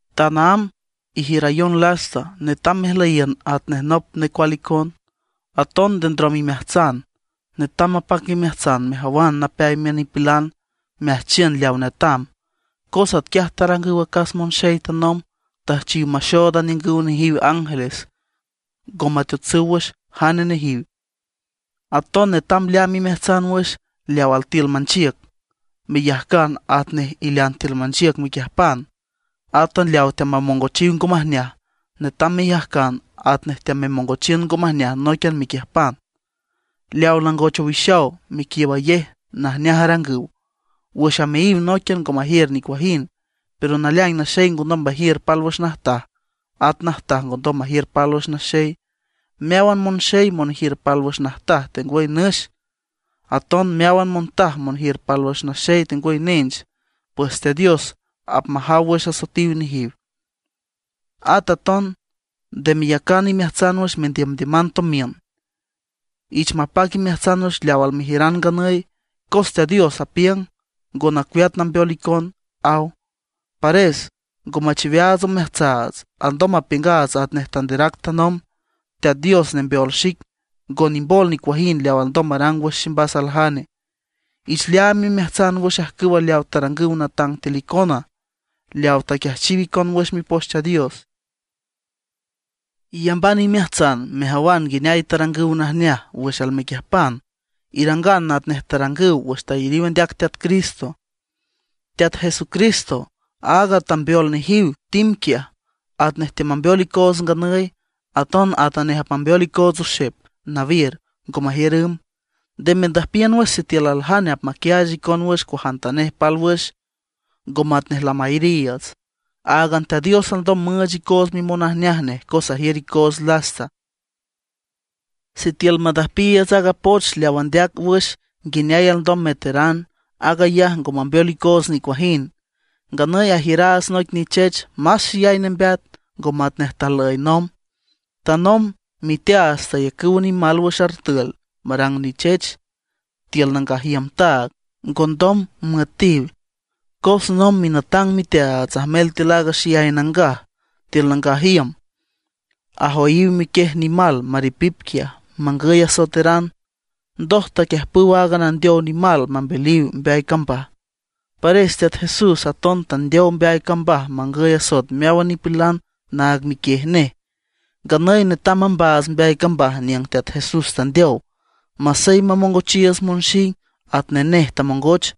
Tanaámb ijiürayon lasta, netam mejlüyiün atnej nop necual icon. Aton nde ndrom imeajtsan, netam mapac imeajtsan mejawan napeay miün nipilan, meajchiün leaw netam. Cos atquiaj tarangüw acas monxey tanomb, tüjchiw maxood aniüngüw nejiw ángeles, ngo mateotsüw wüx jane nejiw. Aton netam leaam imeajtsan wüx leaw altiül manchiüc, meyajcan atnej ilean tiül manchiüc mequiüjpan. Átan leaw teamamongochiw ngo majneaj, netam meyajcan atnej teamemongochiün ngo majneaj nóiquian mequiüjpan. Leaw langoch owixaw mequiiübayej najneaj arangüw, wüx ameayiw nóiquian ngo majiür nicuajind. Pero naleaing naxey ngondom majiür pálwüx najtaj, at najtaj ngondom majiür pálwüx naxey. Meáwan monxey monjiür pálwüx najtaj tengwüy nüx, aton meáwan montaj monjiür pálwüx naxey tengwüy nench, pues Teat Dios apmajaw wüx asoetiw nejiw. At aton nde meyacan imeajtsan wüx mendiümdiüman tomiün. Ich mapac imeajtsan wüx leaw almejiüran nganüy, cos Teat Dios apiüng: “Ngo nacueat nambeol icon”, aw. Pares ngo machiweaats omeajtsaats, alndom mapiüngaats atnej tanderac nomb: Teat Dios nembeol xic, ngo nimbol nicuajind leaw alndom marang wüx ximbas aljane. Ich leaam imeajtsan wüx ajcüw leaw tarangüw natang tiül icona, leaw taquiajchiw icon wüx Mipoch Teat Dios. Iyamban imeajtsan mejawan nguineay tarangüw najneaj wüx almequiüjpan; irangan atnej tarangüw wüx tayariw andeac Teat Cristo. Teat Jesucristo, áag tambeol nejiw tim quiaj, atanej teamambeol icoots nganüy, aton atanej apmambeol icoots oxep nawiür, ngo majiür ümb. Nde mendüjpiün wüx sitiül aljane apmaquiaach icon wüx cuajantanej pálwüx, ngo matnej lamayariiüts. Áagan Teat Dios alndom müüch icoots mimonajneaj nej cos ajiür icoots lasta. Sitiül mandüjpiiüts aaga poch leaw andeac wüx nguineay alndom meteran, aag ayaj ngo mambeol icoots nicuajind. Nganüy ajiüraats noic nichech más xeyay nembeat, ngo matnej tajlüy nomb. Tanomb miteaats tayacüw nimal wüx artül marang nichech tiül nangaj iüm taag, ngondom müetiw. Cos nomb minatang miteaats ajmel tiül aaga Xeyay Nangaj tiül nangaj iüm ajoyiw miquiej nimal maripip quiaj mangüy asoeteran. Ndoj taquiüjpüw aaga nandeow nimal mambeliw mbeay cambaj. Pares Teat Jesús aton tandeow mbeay cambaj mangüy asoet meáwan nipilan naag miquiej nej. Nganüy netam mambaats mbeay cambaj niüng Teat Jesús tandeow, masey mamongochiiüts monxing atnej nej tamongoch.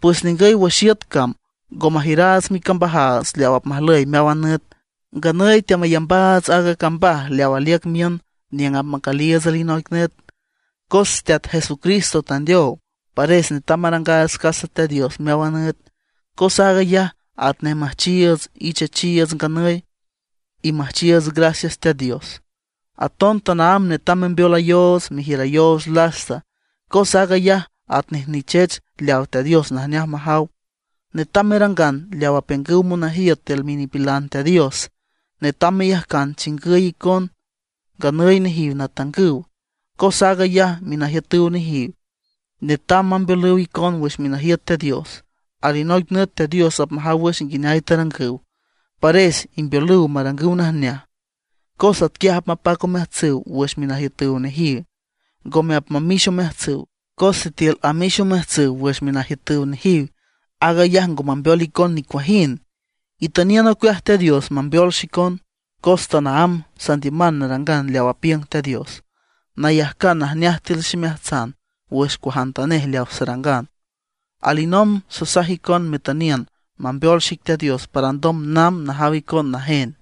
Pues ningüy wüx iüt cam ngo majiüraats micambajaats leaw apmajlüy meáwan nüt. Nganüy teamayambaats aaga cambaj leawa aliüc miün niüng apmacüliiüts alinoic nüt. Cos Teat Jesucristo tandeow, pares netam marangaats casa Teat Dios meáwan nüt, cos aag ayaj atnej müjchiiüts ichechiiüts nganüy, y müjchiiüts gracias Teat Dios. Aton tanaámb netam membeolayoots, mejiürayoots lasta, cos aag ayaj atnej nichech leaw Teat Dios najneaj majaw. Netam merangan leaw apiüngüw monajiüt tiül minipilan Teat Dios; netam meyajcan chingüy icona, nganüy nejiw natangüw. Cos aag ayaj minajiütüw nejiw, netam mambeolüw icon wüx minajiüt Teat Dios. Alinoic nüt Teat Dios apmajaw wüx nguineay tarangüw. Pares imbeolüw marangüw najneaj, cos atquiaj apmapac omeajtsüw wüx minajiütüw nejiw, ngome apmamix omeajtsüw. Cos sitiül amix omeajtsüw wüx minajiütüw nejiw, aag ayaj ngo mambeol icon nicuajind. Itüniün ocueaj Teat Dios mambeol xicon, cos tanaámb sandiüman narangan leaw apiüng Teat Dios, nayajcan najneaj tiül ximeajtsan wüx cuajantanej leaw sarangan. Alinomb sasaj icon metüniün mambeol xic Teat Dios para ndom namb najaw icon najen.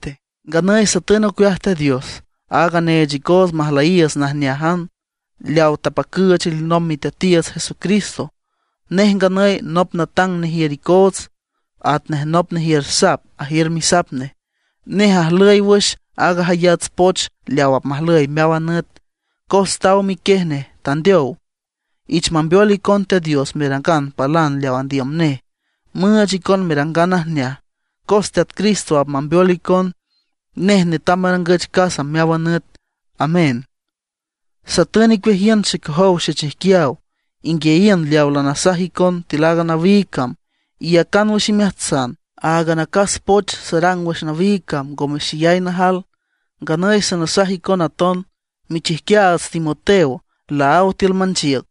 Nganüy satün ocueaj Teat Dios, aaga neech icoots majlüyiiüts najneájan, leaw tapacüüch alinomb Miteatiiüts Jesucristo. Nej nganüy nop natang nejiür icoots, atnej nop nejiür sap ajiür misap nej. Nej ajlüy wüx aaga jayats poch leaw apmajlüy meáwan nüt, cos taw miquiej nej tandeow. Ich mambeol icon Teat Dios merangan palan leaw andiüm nej, müüch icon merangan najneaj, cos Teat Cristo apmambeol icon. Nej netam marangüch casa meáwan nüt. Amén. Satün icueajiün xecojow xechijquiaw, inguiayiün leaw lanasaj icon tiül aaga nawiig cam, iyacan wüx imeajtsan. Áagan acas poch sarang wüx nawiig cam ngome xeyay najal. Nganüy sanasaj icon aton, michijquiaats Timoteo laáw tiül manchiüc.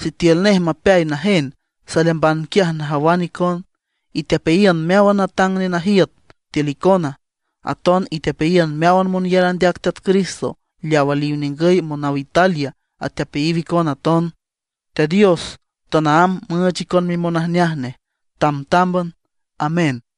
Sitiül nej mapeay najen, saleamban quiaj najawan icon. Itepeayiün meáwan natang nenajiüt tiül icona; aton itepeayiün meáwan monyar andeac Teat Cristo. Leaw aliw ningüy monaw Italia atepeayiw icon aton. Teat Dios tanaámb müüch icon mimonajneaj nej, tamtámban. Amén.